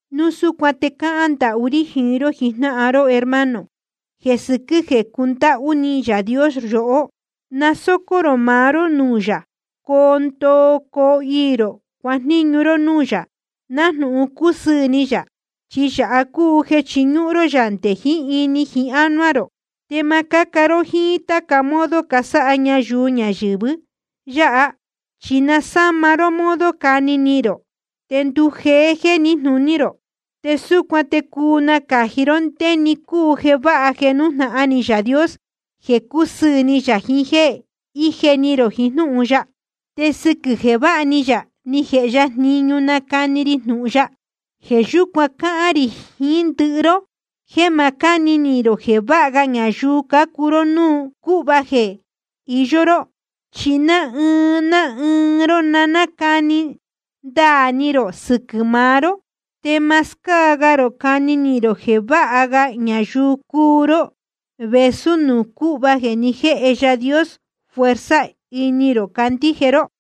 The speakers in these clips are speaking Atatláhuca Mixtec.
Núu súcuan te cáhán ndahú rí jiín ró jijnáhan ró, hermano, jeē sɨquɨ́ jeē cúndáhú ni Yaā Dios yohó. Na sócó rō maá ró núū yā, coo ndoo coo iī rō cuajníñu ró núū yā, nájnūhun cúsɨɨ̄ ni yā. Chi yāha cúu jeē chiñúhún ró yā nde jiín ini jiín ánuá rō. Te ma cáca ró jíín táca modo casáha ñayuu ñayɨ̄vɨ yáha, chi sa na sáma ró modo cani ni rō, te ndujeé jéē níjnūní rō. Te súcuan te cuu nacāji ró ndé‑ni cúu jeē váha jeē nújnahan ni Yaā Dios, jeē cúsɨɨ̄ ni yā, jiín jéē íje ni rō jiín jnúhun ya. Te sɨquɨ̄ jeē váha ni yā ni jēhe ya jniñu nácani ri jnūhun ya, jeē yúcuan cáhán rī jiín ndɨhɨ ró jéē ma cáni ni rō jeē váha ga ñayuu cúu ró núū cūhva jeē iyó ró. Chi ná ɨɨn ná ɨɨn ró na cáni ndaā ni rō sɨquɨ̄ maá ró, te ma scáa ga rō cani ni rō jeē váha ga ñayuu cúu ró vēsú nuū cūhva jeē ni jéhe Yaā Dios fuerza ini rō cándíje ró.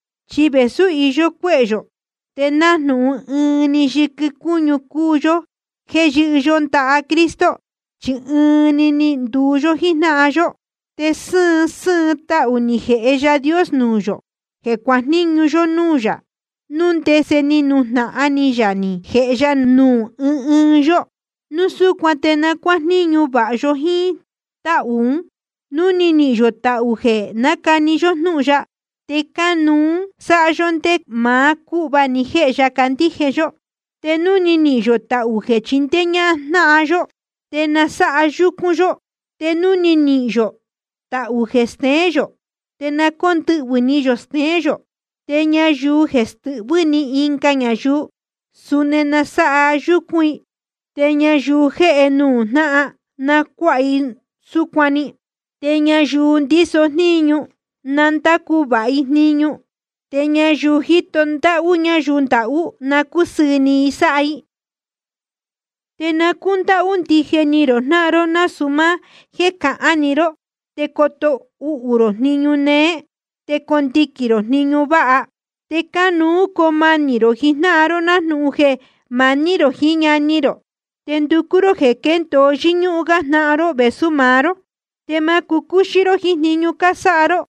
Chi vēsú iyó cuéhē yō, te nájnūhun ɨɨn‑ni yɨquɨ cúñu cúu yó jéē yɨ́hɨ yó ndaha Cristo, chi ɨɨn‑ni ni nduu yó jíjnáhan yó. Te sɨ́ɨn sɨ́ɨn tahū ni jēhe Yaā Dios nuū yō jeē cuajníñu yó núū yā, núu ndese ni nujnahan ni yā ni jēhe ya nuū ɨɨn ɨɨn yó. Núu súcuan te na cuájníñu vāha yó jíín táhū ún. Núu ni nihīn yō tahū jeē nácani yó jnúhun ya, te cánuú sáha yó ndé maá cúhva ni jēhe ya cándíje yó. Te núu ni nihīn yō tahū jeē chindéé ñáhán yó jnáhan yó, te na sáha yúcún yó. Te núu ni nihīn yō tahū jeē steén yō, te na cóndɨhvɨ̄ ni yō steén yō. Te ñayuu jeē stɨhvɨ́ ni ɨnga ñayuu, suni na sáha yúcún i. Te ñayuu jéhe nuū jnáhan, na cuáha i súcuan‑ni. Te ñayuu ndíso jníñu, na ndácu vāha i jniñu. Te ñayuu jíto ndáhú ñayuu ndahú, na cúsɨɨ̄ ni i sáha i. Te na cúndáhú ndije ni rō jnáhan ró, nasūu máá jéē cahán‑ni ró. Te coto uhū rō jniñu néé, te condiquīn rō jniñu váha. Te cánuú coo manī rō jiín jnáhan ró nájnūhun jéē maní rō jiín ñani rō. Te nducú ró jeē quéndōo yɨ́ñúhún gá jnáhan ró vēsú maá ró. Te ma cucúxí ró jiín jniñu cásáha ró.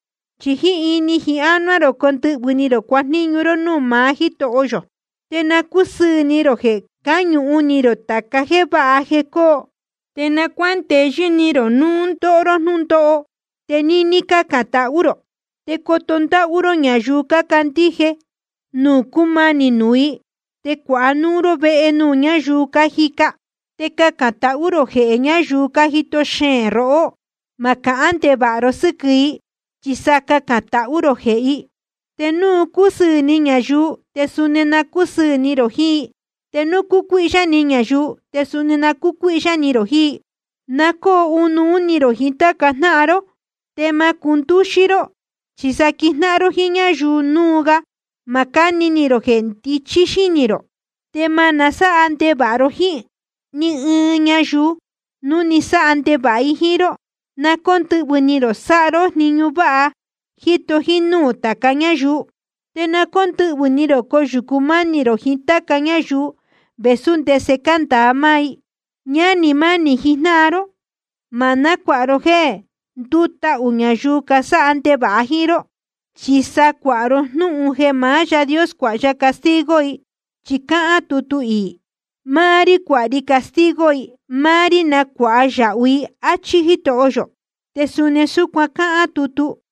Chi jíín ini jiín ánuá rō condɨhvɨ̄ ni rō cuajníñu ró núū maá Jítoho yō. Te na cúsɨɨ̄ ni rō jeē cáñuhun ni rō tāca jéē váha jeē cóo. Te na cuándeyɨ́ ni rō núu ndóho ró jnúndóho. Te níní na cácán tahú rō. Te coto ndáhú ró ñayuu cácandíje núu cúmanī nuū i. Te cuāha núu ró vehe nuū ñáyuu cájica. Te cacān tahú rō jehē ñayuu cájito xeēn rohó. Ma cahán ndevāha ro sɨ́quɨ̄ i, chi sa cacān tahú rō jehē i. Te núu cúsɨɨ̄ ni ñayuu, te suni na cúsɨɨ̄ ni rō jiín i. Te núu cúcuíhyá ni ñayuu, te suni na cúcuíhyá ni rō jiín i. Na cóo ɨnuú ni rō jiín táca jnáhan ró. Te ma cundúxí ró, chi sa quijnáhan ró jíín ñáyuu núu ga. Ma cáni ni rō jeē ndichí xínī rō. Te ma nasáha ndevāha ró jíín ni ɨɨn ñayuu, núu ni sáha ndevāha i jíín ró. Na cóndɨhvɨ̄ ni rō sáha ró jniñu váha, jíto jínúū tāca ñáyuu. Te na cóndɨhvɨ̄ ni rō coyūcu mánī rō jiín táca ñáyuu, vēsú ndese cándāa máá i. Ñánī mánī jijnáhan ró, ma nácuāha ró jéē ndútahū ñayuu casáha ndevāha jíín ró, chi sa cuāha ró jnúhun jeē maá Yaā Dios cuāha ya castigo i. Chi cáhán tutu iī: Máá rí cuāha castigo i, máá rí nacuāha yāhu i, áchí Jítoho yō. Te suni cáhán tutu: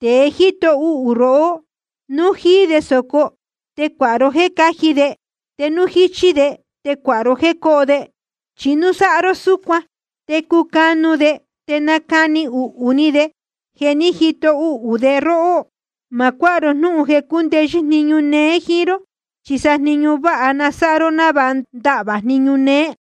Tēe jíto uhū rohó, núu jíí de sōco, te cuāha ró jéē cáji de. Te núu jíchí de, te cuāha ró jéē cóho de. Chi núu sáha ró súcuan, te cucanu de te nacani uhū ni de jeē ni jíto uhū de róhó. Ma cuáha ró jnúhun jeē cúndeyɨ́ jniñu néé jíín ró, chi sa jniñu váha na sáha ró návāha ndahvā jniñu néé.